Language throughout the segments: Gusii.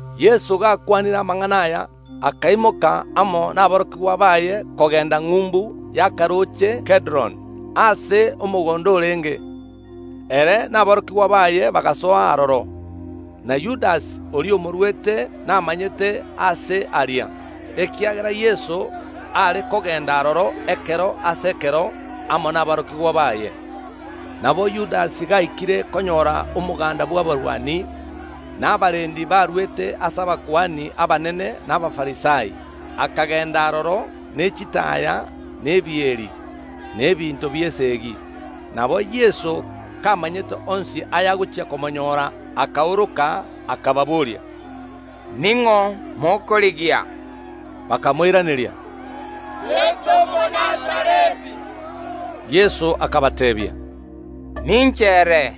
Yeso gakwanire amang’ana aya, akaimoka amo naborokigwa baye kogenda ng’umbu y’akarooche Kedron, aase omogondo orenge. Ere na aborokigwa baye bagasoa aroro. Na Yudasi, oria omoruete naamanyete aase aria, ekiagera Yeso are kogenda aroro ekero ase ekero amo naborokigwa baye. Nabo Yudasi gaikire konyora omoganda bw’abarwani, na abarendi baruete ase abakuani abanene na Abafarisai, akagenda aroro ne chitaaya na ebieri, na ebinto bi’esegi. Nabo Yeso, kamanyete onsi ayagochia komonyoora, akaoroka, akababoria, “Ning’o mokorigia?” Bakamoiraneria, “Yeso Omonazareti.” Yeso akabateebia, “Ninche ere.”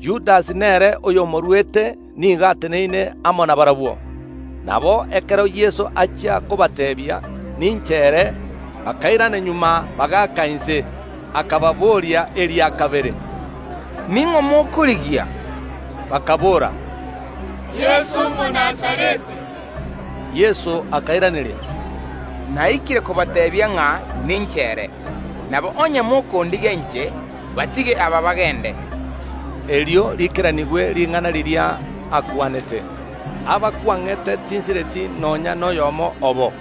Yudasi nere oyomoruete nigo ateneine amo nabarabwo. Nabo ekero Yeso achia kobateebia, “Ninche ere,” bakairana magega, bagaaka inse. Akababoria eria kabere, “Ning’o mokorigia?” Bakaboora, “Yeso Omonazareti.” Yeso akairaneria, “Naikire kobateebia ng’a ninche ere; nabo onye mokondigia inche, batige aba bagende.” Erio riikeranigwe ring’ana riria akwanete, “Aba kwang’ete tinsireti nonya noyomo obo.”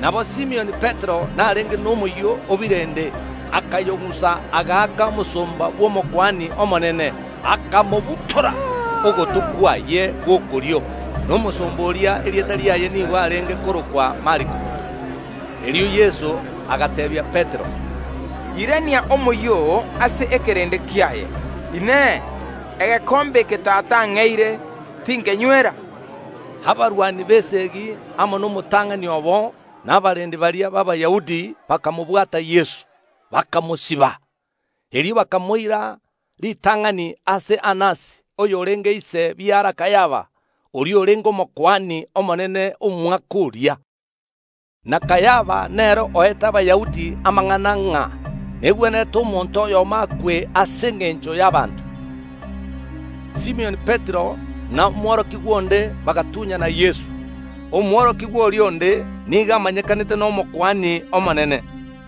Nabo Simioni Petero narenge nomoyio o birende, akayong’usa, agaaka omosomba bw’Omokuani omonene, akamobutora ogoto kwaye gw’okorio. Na omosomba oria erieta riaye nigo are korokwa Maliko. Erio Yeso agateebia Petero, “Irania omoyio oo ase ekeraano kiaye. Inee! Egekombe eke Tata ang’eire, tinkenywera?” Abarwani b’esegi amo nomotang’ani obo, na abarendi baria b’Abayahudi bakabwata Yeso, bakamosiba. Erio bakamoira ritang’ani ase Anasi oyorenge ise biara Kayafa, oria orenge Omokuani omonene omwaka oria. Na Kayafa nere oete Abayahudi amang’ana ng’a negwenerete omonto oyomo akwe ase engencho y’abanto. Simioni Petero na omworokigwa onde bagatunyana Yeso. Omworokigwa oria onde nigo amanyekanete n’Omokuani omonene,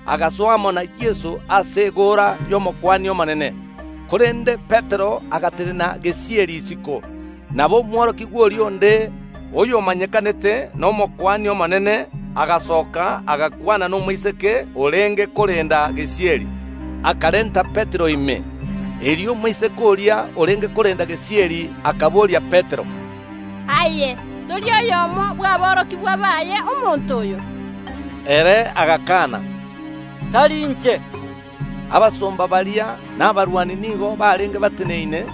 agasoa amo na Yeso ase egoora y’Omokuani omonene, korende Petero agatenena gesieri isiko. Nabo omworokigwa oria onde, oyomanyekanete n’Omokuani omonene agasoka agakwana nomoiseke orenge korenda gesieri, akarenta Petero ime. Erio omoiseke oria orenge korenda gesieri akaboria Petero, “Aye tori oyomo bw’aborokigwa baye omonto oyo?” Ere agakana, “Tari inche.” Abasomba baria na abarwani nigo barenge bateneine,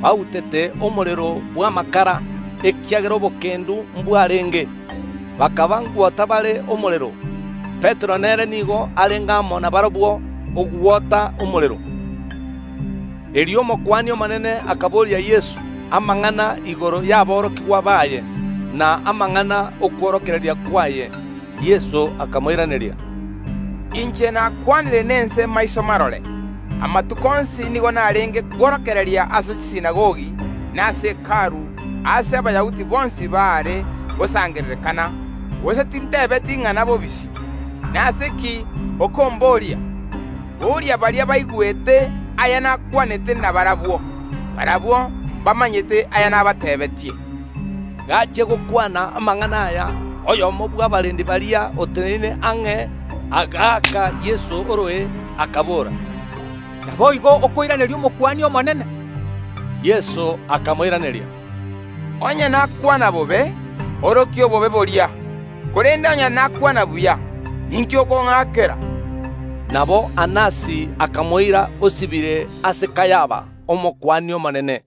bautete omorero bw’amakara, ekiagera obokendu mbwarenge, bakaba ngwota bare omorero. Petero nere nigo arenge amo nabarabwo, ogwota omorero. Erio Omokuani omonene akaboria Yeso amang’ana igoro yaborokigwa baye, na amang’ana ’okworokereria kwaye. Yeso akamoiraneria, “Inche nakwanire nense maiso marore. Amatuko onsi nigo narenge kworokereria ase chisinagogi na ase Hekalu, aase Abayahudi bonsi baare gosangererekana, gose tintebeti ing’ana bobisi. Nase ki okomboria? Boria baria baigwete aya nakwanete nabarabwo; barabwo mbamanyete aya nabateebeetie.” Gachia gokwana amang’ana aya, oyomo bw’abarendi baria oteneine ang’e, agaaka Yeso oroe, akabora, “Naboigo okoiraneria Omokuani omonene?” Yeso akamoiraneria, “Onye nakwana bobe, orokia obobe boria, korende onye nakwana buya, ninki okong’akera?” Nabo Anasi akamoira osibire ase Kayafa, Omokuani omonene.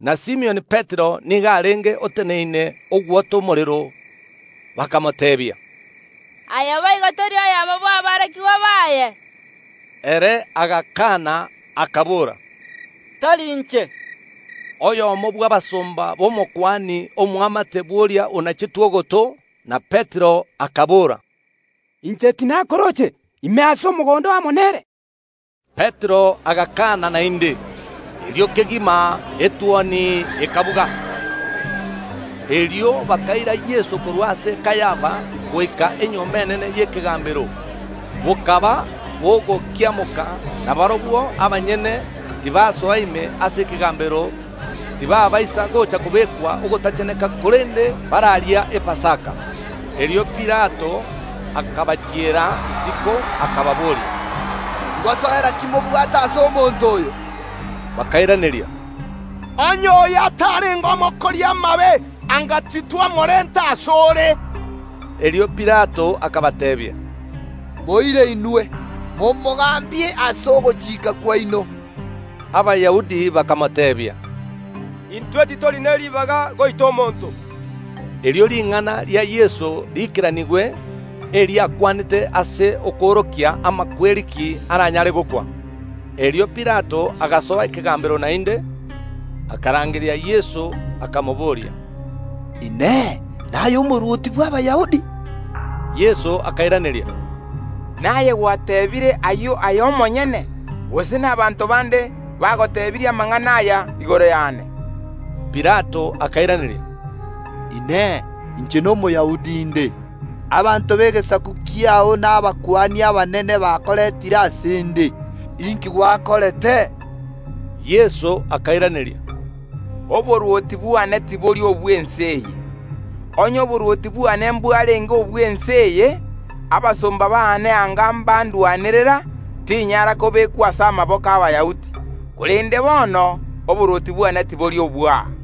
Na Simioni Petero nigo arenge oteneine ogwota omorero. Bakamoteebia, “Aye boigo tori oyomo bw’aborokigwa baye?” Ere agakana, akabora, “Tari inche.” Oyomo bw’abasomba b’Omokuani Omonene, omoamate bw’oria onachetwe ogoto na Petero, akabora, “Inche tinakorooche ime ase omogondo amo nere?” Petero agakana naende. Erio kegima etuoni ekabuga. Erio bakaira Yeso korwa ase Kayafa goika enyomba enene y’ekegambero. Bokaba bogokiamoka, na barabwo abanyene tibasoa ime ase ekegambero, tibaabaisa gocha kobekwa ogotacheneka korende bararia Epasaka. Erio Pilato akabachiera isiko, akababoria, “Ngosoera ki mobwate ase omonto oyo?” Bakairaneria, “Onye oyo atarenge omokori amabe, anga titwamorenta ase ore.” Erio Pilato akabateebia, “Moire inwe, momogambie ase ogochika kwaino.” Abayahudi bakamoteebia, “Intwe titori ne ribaga goita omonto.” Erio ring’ana ria Yeso riikeranigwe, eri akwanete ase okoorokia imakweri ki aranyare gokwa. Erio Pilato agasoa ekegambero naende, akarangeria Yeso, akamobooria, “Inee! Naye omorwoti bw’Abayahudi?” Yeso akairaneria, “Naye gwateebire ayio aye omonyene, gose nabaanto bande bagotebirie amang’ana aya igoro yane?” Pilato akairaneria, “Inee! Inche n’Omoyahudi nde? Abanto b’egesaku kiao na abakuani abanene bakorentire ase ’nde. Inki gwakorete?” Yeso akairaneria, “Oborwoti bwane tibori obw’ense eye. Onye oborwoti bwane mbwarenge obw’ense eye, abasomba baane anga mbandwanerera, tinyara kobekwa ase amaboko ’Abayahudi, korende bono oborwoti bwane tibori obw’aa.”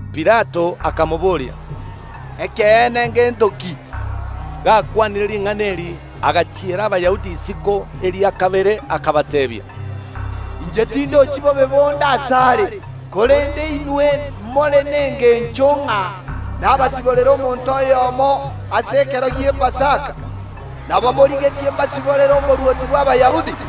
Pilato akamobooria, “Ekeene ngento ki?” Gakwanire ring’ana eri agachiera Abayahudi isiko eria kabere, akabateebia, “Inche tindochi bobe bonde asare. Korende inwe more nengencho ng’a nabasiborera omonto oyomo ase ekero ki’Epasaka; nabo morigetie mbasiborere Omorwoti bw’Abayahudi?”